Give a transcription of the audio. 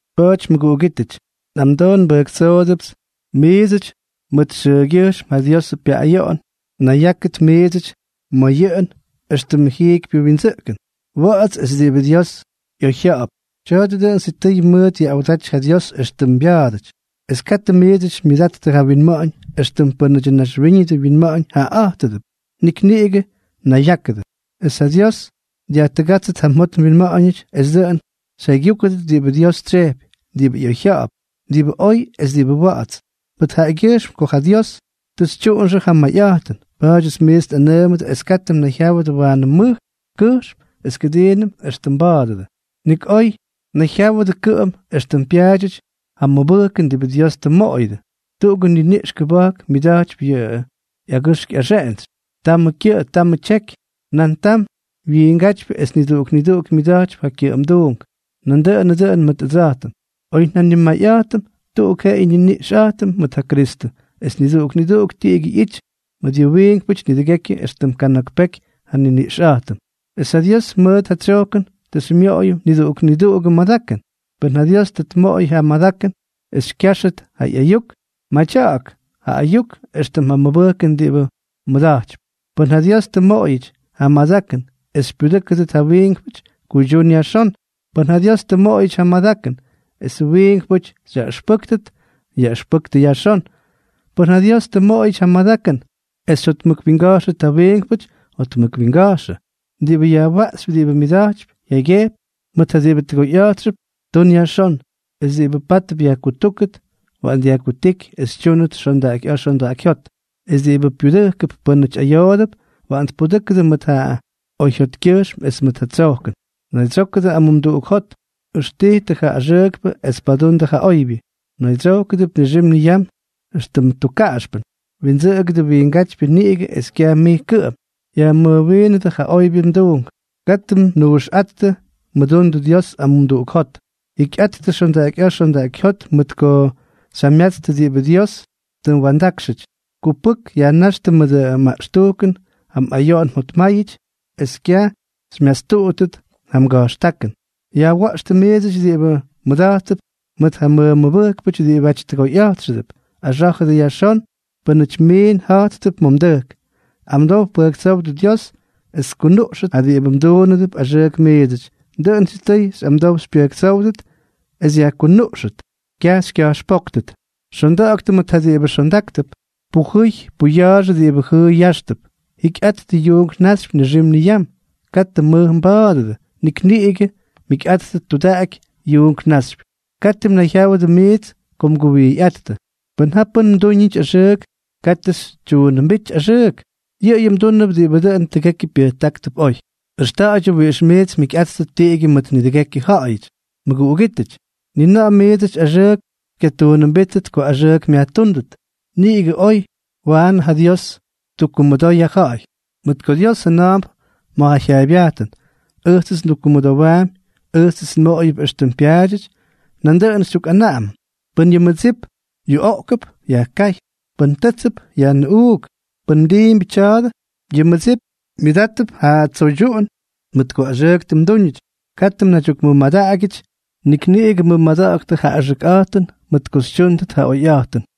Pa̱a̱ty mʉguꞌugítʉty, nꞌamdoo nbʉjktsoodʉpts miidsʉty mʉt yʉꞌʉgyʉjxm ja Diosʉ pyaꞌꞌayoꞌon, nayyákʉdʉ miidsʉty ma̱ yʉꞌʉn éxtʉmʉ jiikypyʉ windsʉꞌkʉn, wa̱ꞌa̱ts es diꞌibʉ Dios ꞌyoyjya̱ꞌa̱p. Tya̱a̱dʉ dʉꞌʉn sitʉy mʉʉt yaꞌꞌawdaty ja Dios éxtʉm mbya̱a̱dʉty. Es katʉ miits xymyʉdattʉ ja winma̱ꞌa̱ñ éxtʉm pʉ́nʉdyʉ naxwíñʉdʉ winma̱ꞌa̱ñ jaꞌaꞌa̱jtʉdʉp, nik niꞌigʉ nayyákʉdʉ es ja Dios dyajtʉgátsʉt ja mjot mwinma̱ꞌa̱ñʉty es dʉꞌʉn xyjaygyúkʉdʉt diꞌibʉ Dios tsyejpy, diꞌibʉ ꞌyoyjya̱ꞌa̱p, diꞌibʉ oy es diꞌibʉ wa̱ꞌa̱ts. Mʉt jaꞌagyʉjxm kots ja Dios tʉ xytyuꞌunxʉ ja mayꞌa̱jtʉn, pa̱a̱dyʉts miits nꞌanʉʉmʉdʉ es katʉ mnayjyáwʉdʉ waanʉ mʉj kʉjxm es kʉdiinʉm éxtʉm mba̱a̱dʉdʉ. Nik oy nayjyáwʉdʉ kʉꞌʉm éxtʉm pyaadyʉty ja mʉbʉjkʉn diꞌibʉ Dios tʉ mmoꞌoyʉdʉ. Tuꞌugʉ niniꞌx kʉba̱jk myʉda̱jtypy yʉꞌʉ ꞌyagʉxk ꞌyaxeꞌentsy. Tamʉ kyʉꞌʉ, tamʉ tyeky, nan tam wiingátypyʉ, es niduꞌuk niduꞌuk myʉda̱jtypy ja kyʉꞌʉmduunk. Nandʉꞌʉnʉ dʉꞌʉn mʉt ʉdsa̱jtʉm, oy njanimayꞌa̱jtʉm, tuꞌuk jeꞌeyʉ niniꞌx nꞌijtʉm mʉt ja Kristʉ, es niduꞌuk niduꞌuk tiꞌigyʉ ꞌyity mʉt yʉ wiinkpʉty nidʉgekyʉ éxtʉm kana̱k peky ja nniniꞌxꞌa̱jtʉm. Es ja Dios mʉt ja tsyojkʉn tʉ xymyoꞌoyʉm niduꞌuk niduꞌugʉ madakʉn. Pʉn ja Dios tʉ mmoꞌoyʉ ja madakʉn es xykya̱jxʉt ja ꞌyayuk, madya̱ꞌa̱k ja ayuk éxtʉm ja mʉbʉjkʉn diꞌibʉ mmʉda̱jtypy. Pʉn ja Dios tʉ mmoꞌoyʉty ja madakʉn es xypyudʉ́kʉt ja wiinkpʉty, kuydyún yajxón. Pʉn ja Dios tʉ mmoꞌoyʉty ja madakʉn esʉ wiinkpʉty xyaꞌʉxpʉ́kʉt, yaꞌʉxpʉktʉ yajxón. Pʉn ja Dios tʉ mmoꞌoyʉty ja madakʉn es xyjotmʉkwinga̱jxʉt ja wiinkpʉty, jotmʉkwinga̱jxʉ. Diꞌibʉ yajwaꞌxypy diꞌibʉ myʉda̱jty jyaygyejpy mʉt ja diꞌibʉ tʉgoyꞌa̱jtxʉp, tun yajxón. Es diꞌibʉ pátʉp yajkutúkʉt, waꞌan dyajkutíky es tyúnʉt xondaꞌakyꞌa̱a̱ xondaꞌakyjyót. Es diꞌibʉ pyudʉjkʉp pʉ́nʉty ayoodʉp, waꞌan tpudʉ́kʉdʉ mʉt ja oyjyotkyʉjxm es mʉt ja tsojkʉn. Naydsyókʉdʉ amumduꞌuk jot. Ʉxtijtʉ ja axʉʉkpʉ es padundʉ ja oybyʉ. Mnaydsyókʉdʉp nixim niyam éxtʉm tukkaꞌaxpʉn. Windsʉꞌʉgʉdʉ wiingátypyʉ niꞌigʉ es kyaj mij kʉꞌʉm. Yajmʉjwiinʉdʉ ja oybyʉ tuunk. Katʉ mnuuxꞌáttʉ. Mʉdundʉ Dios amumduꞌuk jot. Jikyꞌattʉ xondaꞌakyꞌa̱a̱ xondaꞌakyjyót mʉt ko xyjamyatstʉ diꞌibʉ Dios tʉ mwa̱ndákxʉty. Kupʉk yajnáxtʉ mʉdʉ maꞌxtujkʉn ja mꞌayoꞌon mjotmáyʉty es kyaj xymyastuꞌuttʉt ja mga̱jxtákʉn. Yajwa̱ꞌxtʉ miidsʉty diꞌibʉ mmʉda̱jttʉp mʉt ja mmʉmʉbʉjkpʉty diꞌibáty tʉgoyꞌa̱jtxʉdʉp. Axá̱jʉdʉ yajxón pʉ́nʉty miin ja̱jttʉp ma̱ mdʉjk. Amdow pʉjktsówdʉ Dios es tkunuꞌxʉt ja diꞌibʉ mduunʉdʉp axʉʉk miidsʉty. Dʉꞌʉn sitʉy xyꞌamdow xypyʉjktsówʉt es yajkunuꞌxtʉt, kyaj xykya̱jxpóktʉt. Xonda̱ꞌa̱ktʉ mʉt ja diꞌibʉ xondáktʉp. Pujʉy puya̱a̱xʉ diꞌibʉ jʉʉy yáxtʉp. Jikyꞌattʉ yuunk naxypy nixim niyam. Katʉ mmʉj mba̱a̱dʉdʉ, nik niꞌigʉ mjikyꞌáttʉt tudaꞌaky yuunk naxypy. Katʉ mnayjyáwʉdʉ miits ko mguwijyꞌáttʉ. Pʉn ja pʉ́n mdúñʉty axʉʉk, katʉ xytyuunʉmbíty axʉʉk. Yʉꞌʉyʉ mdúnʉp diꞌibʉ dʉn tʉgekyʉ pyʉjtáktʉp oy. Ʉxta̱ꞌa̱ydyʉ wiꞌix miits mjikyꞌáttʉt tiꞌigyʉ mʉt nidʉgekyʉ ja̱ꞌa̱yʉty. Mʉguꞌugítʉty, ni na̱ꞌa̱ miidsʉty axʉʉk xykyatuunʉmbíttʉt ko axʉʉk myajtúndʉt, niꞌigʉ oy waꞌan ja Dios ttukkumʉdoy ja ja̱ꞌa̱y; mʉt ko Dios jʉna̱a̱mp ma̱ ja jyaaybyajtʉn: “Ʉjtsʉts ndukkumʉdowaampy; ʉjtsʉts nmoꞌoyʉp éxtʉm pyaadyʉty.” Nandʉꞌʉn xytyukꞌanaꞌamʉm: “Pʉn yʉ mmʉdsip yuꞌoꞌkʉp, yajkáy. Pʉn tʉ́tsʉp, yajnʉꞌuuk. Pʉn mdiimbyʉ tya̱a̱dʉ, yʉ mmʉdsip myʉdátʉp ja tsoydyuꞌun mʉt ko axʉʉk tʉ mdúñʉty.” Katʉ mnaydyukmʉmadaꞌagyʉty ja axʉkꞌa̱jtʉn, nik niꞌigʉ mʉmada̱ꞌa̱ktʉ ja axʉkꞌa̱jtʉn mʉt ko xytyúndʉt ja oyꞌa̱jtʉn.